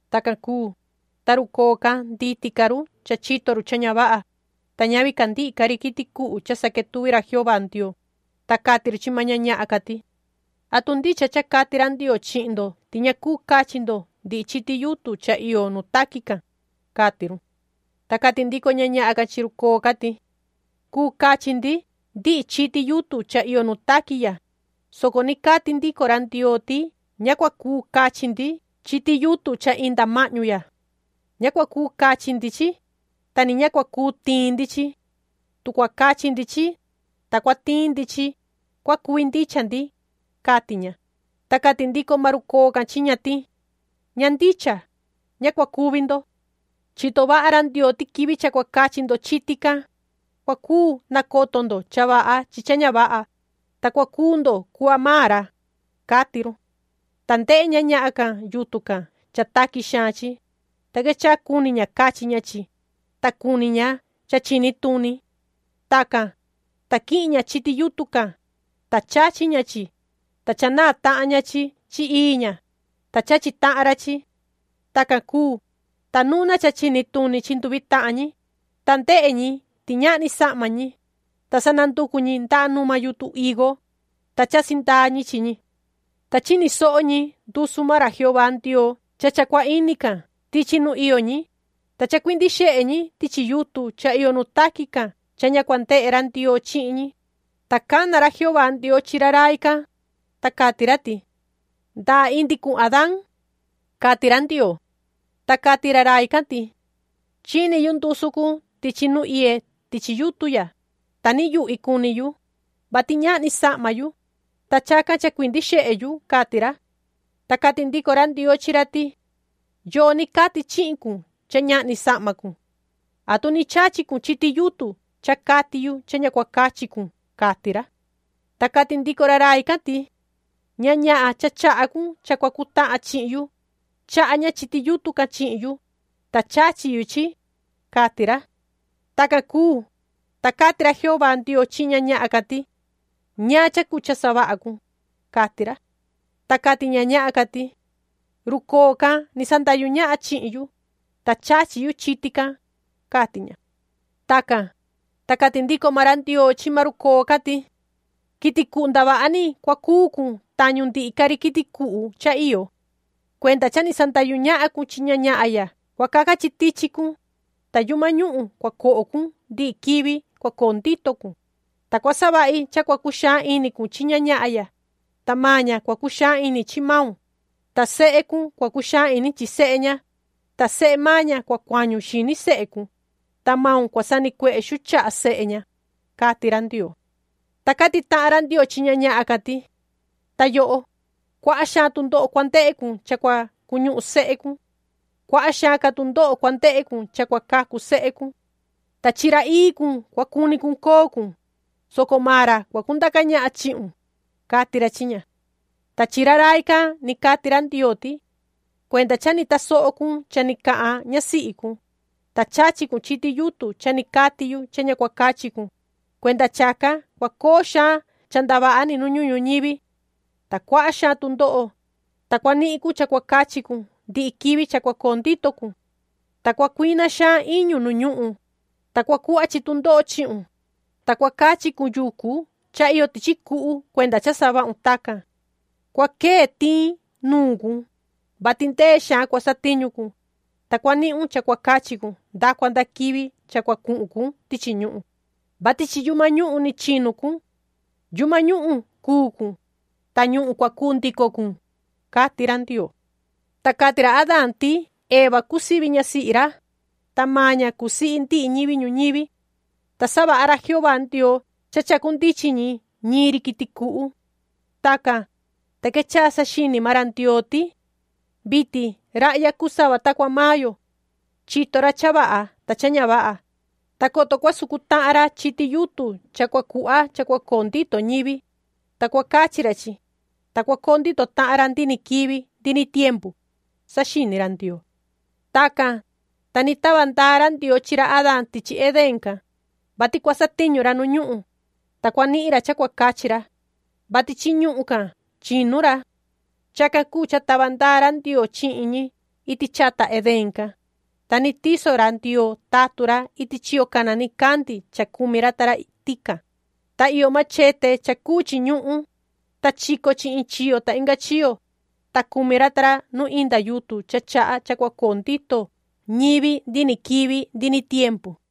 Tacan cuu, ta run coo can nditi ca run cha chito run cha ña vaha, ta ñavi ca ndihi ca ri quiti cuhu cha saquetuvi ra Jehová Ndioo, ta cati run chi maan ña ñahan can ti: ―¿Atu ndicha cha cati ra Ndioo chihin ndo ti ña cuu cachi ndo ndihi chiti yutun cha iyo nu taqui can? ―cati run. Ta cati ndico ña ñahan can chi run coo can ti: ―Cuu cachi ndi ndihi chiti yutun cha iyo nu taqui ya, soco ni cati ndico ra Ndioo ti ña cua cuu cachi ndi chiti yutun cha inda mahñu ya. Ña cua cuu cachi ndi chi, ta ni ña cua cuu tiin ndi chi. Tu cua cachi ndi chi, ta cua tiin ndi chi, cua cuvi ndicha ndi ―cati ña. Ta cati ndico maan run coo can chi ña ti: ―Ña ndicha, ña cua cuvi ndo. Chito vaha ra Ndioo ti quivi cha cua cachi ndo chiti can, cua cuu nacoto ndo cha vaha chi cha ña vaha, ta cua cuu ndo cuhva cuu maan ra ―cati run. Ta ndehe ña ñahan can yutun can cha taqui xaan chi, ta quechaha cuni ña cachi ña chi, ta cuni ña cha chini tuni. Tacan, ta quihin ña chiti yutun can, ta chachi ña chi, ta cha naan tahan ña chi chi ii ña, ta chachi tahan ra chi. Tacan cuu, ta nuna cha chini tuni chi nduvi tahan ñi, ta ndehe ñi ti ñahni sahma ñi, ta sa nanducu ñi ndaha numa yutun higo, ta chasi ndaa ñi chi ñi. Ta chini soho ñi ndusu maan ra Jehová Ndioo cha cha cua ini can tichi nu iyo ñi, ta chacuindi xehe ñi tichi yutun cha iyo nu taqui can cha ña cua ndehe ra Ndioo chihin ñi, ta cana ra Jehová Ndioo chi ra rai can, ta cati ra ti: ―¿Ndaa indi cun, Adaan? ―cati ra Ndioo. Ta cati ra rai can ti: ―Chini yu ndusu cun tichi nu iye tichi yutun ya, ta niyuhvi cuni yu, vati ñahni sahma yu, ta chacan chacuindi xehe yu ―cati ra. Ta cati ndico ra Ndioo chi ra ti: ―¿Yoo ni cati chihin cun cha ñahni sahma cun? ¿Atu ni chachi cun chiti yutun cha cati yu cha ña cua cuu cachi cun? ―cati ra. Ta cati ndico ra rai can ti: ―Ña ñahan cha chaha cun cha cua cutahan chihin yu, chaha ña chiti yutun can chihin yu, ta chachi yu chi ―cati ra. Tacan cuu, ta cati ra Jehová Ndioo chihin ña ñahan can ti: ―¿Ñaan cha cuu cha savaha cun? ―cati ra. Ta cati ña ñahan can ti: ―Run coo can ni sandahyu ñahan chihin yu, ta chachi yu chiti can ―cati ña. Tacan, ta cati ndico maan ra Ndioo chi maan run coo can ti: ―Quiti cuhu ndavaha ni cua cuu cun tañu ndihi ca ri quiti cuhu cha iyo. Cuenda cha ni sandahyu ñahan cun chi ña ñahan ya cua caca chi tichi cun, ta yuhma ñuhun cua coho cun ndihi quivi cua coo ndito cun, ta cua savahi cha cua cuxaan ini cun chi ña ñahan ya, ta maan ña cua cuxaan ini chi maun, ta sehe cun cua cuxaan ini chi sehe ña, ta sehe maan ña cua cuañu xini sehe cun, ta maun cua sanicuehe xuu chaha sehe ña ―cati ra Ndioo. Ta cati tahan ra Ndioo chi ña ñahan can ti: ―Ta yoho, cuaha xaan tundoho cua ndehe cun cha cua cuñuhun sehe cun. Cuaha xaan ca tundoho cua ndehe cun cha cua cacu sehe cun. Ta chi ra ii cun cua cuni cun coo cun, soco maan ra cua cundaca ñahan chihun ―cati ra chi ña. Ta chi ra rai can ni cati ra Ndioo ti: ―Cuenda cha ni tasoho cun cha ni cahan ñasihi cun, ta chachi cun chiti yutun cha ni cati yu cha ña cua cachi cun, cuenda chacan cua coo xaan cha ndavaha ni nu ñuhun ñuñivi. Ta cuaha xaan tundoho, ta cua nihin cun cha cua cachi cun ndihi quivi cha cua coo ndito cun. Ta cua cuina xaan iñu nu ñuhun, ta cua cuhva chi tundoho chihun, ta cua cachi cun yucu cha iyo tichi cuhu cuenda cha savahun tacan. Cua quee tiin nuun cun, vati ndee xaan cua satiñu cun, ta cua nihun cha cua cachi cun nda cua nda quivi cha cua cuhun cun tichi ñuhun, vati chi yuhma ñuhun ni chinu cun. Yuhma ñuhun cuu cun, ta ñuhun cua cuu ndico cun ―cati ra Ndioo. Ta cati ra Adaan ti Eva cuu sivi ñasihi ra, ta maan ña cuu sihi ndihi ñivi ñuñivi. Ta savaha ra Jehová Ndioo cha chacunduchin ñi ñiin ri quiti cuhu. Tacan, ta quechaha saxini maan ra Ndioo ti: “Vitin rahya cuu sava ta cua maan yo. Chito ra cha vaha ta cha ña vaha, ta coto cua sucu tahan ra chiti yutun cha cua cuhva cha cua coo ndito ñivi, ta cua cachi ra chi, ta cua coo ndito tahan ra ndihi ni quivi ndihi ni tiempu”, saxini ra Ndioo. Tacan, ta ni tava ndaa ra Ndioo chi ra Adaan tichi Edén can, vati cua satiñu ra nu ñuhun, ta cua nihin ra cha cua cachi ra, vati chi ñuhun can chinu ra. Chacan cuu cha tava ndaa ra Ndioo chihin ñi iti chata Edén can, ta ni tiso ra Ndioo tatun ra iti chiyo cana nicandi cha cumi ra ta ra tican, ta iyo machete cha cuu chi ñuhun, ta chico chi in chiyo ta inga chiyo, ta cumi ra ta ra nu inda yutun chaha cha cua coo ndito ñivi ndihi ni quivi ndihi ni tiempu.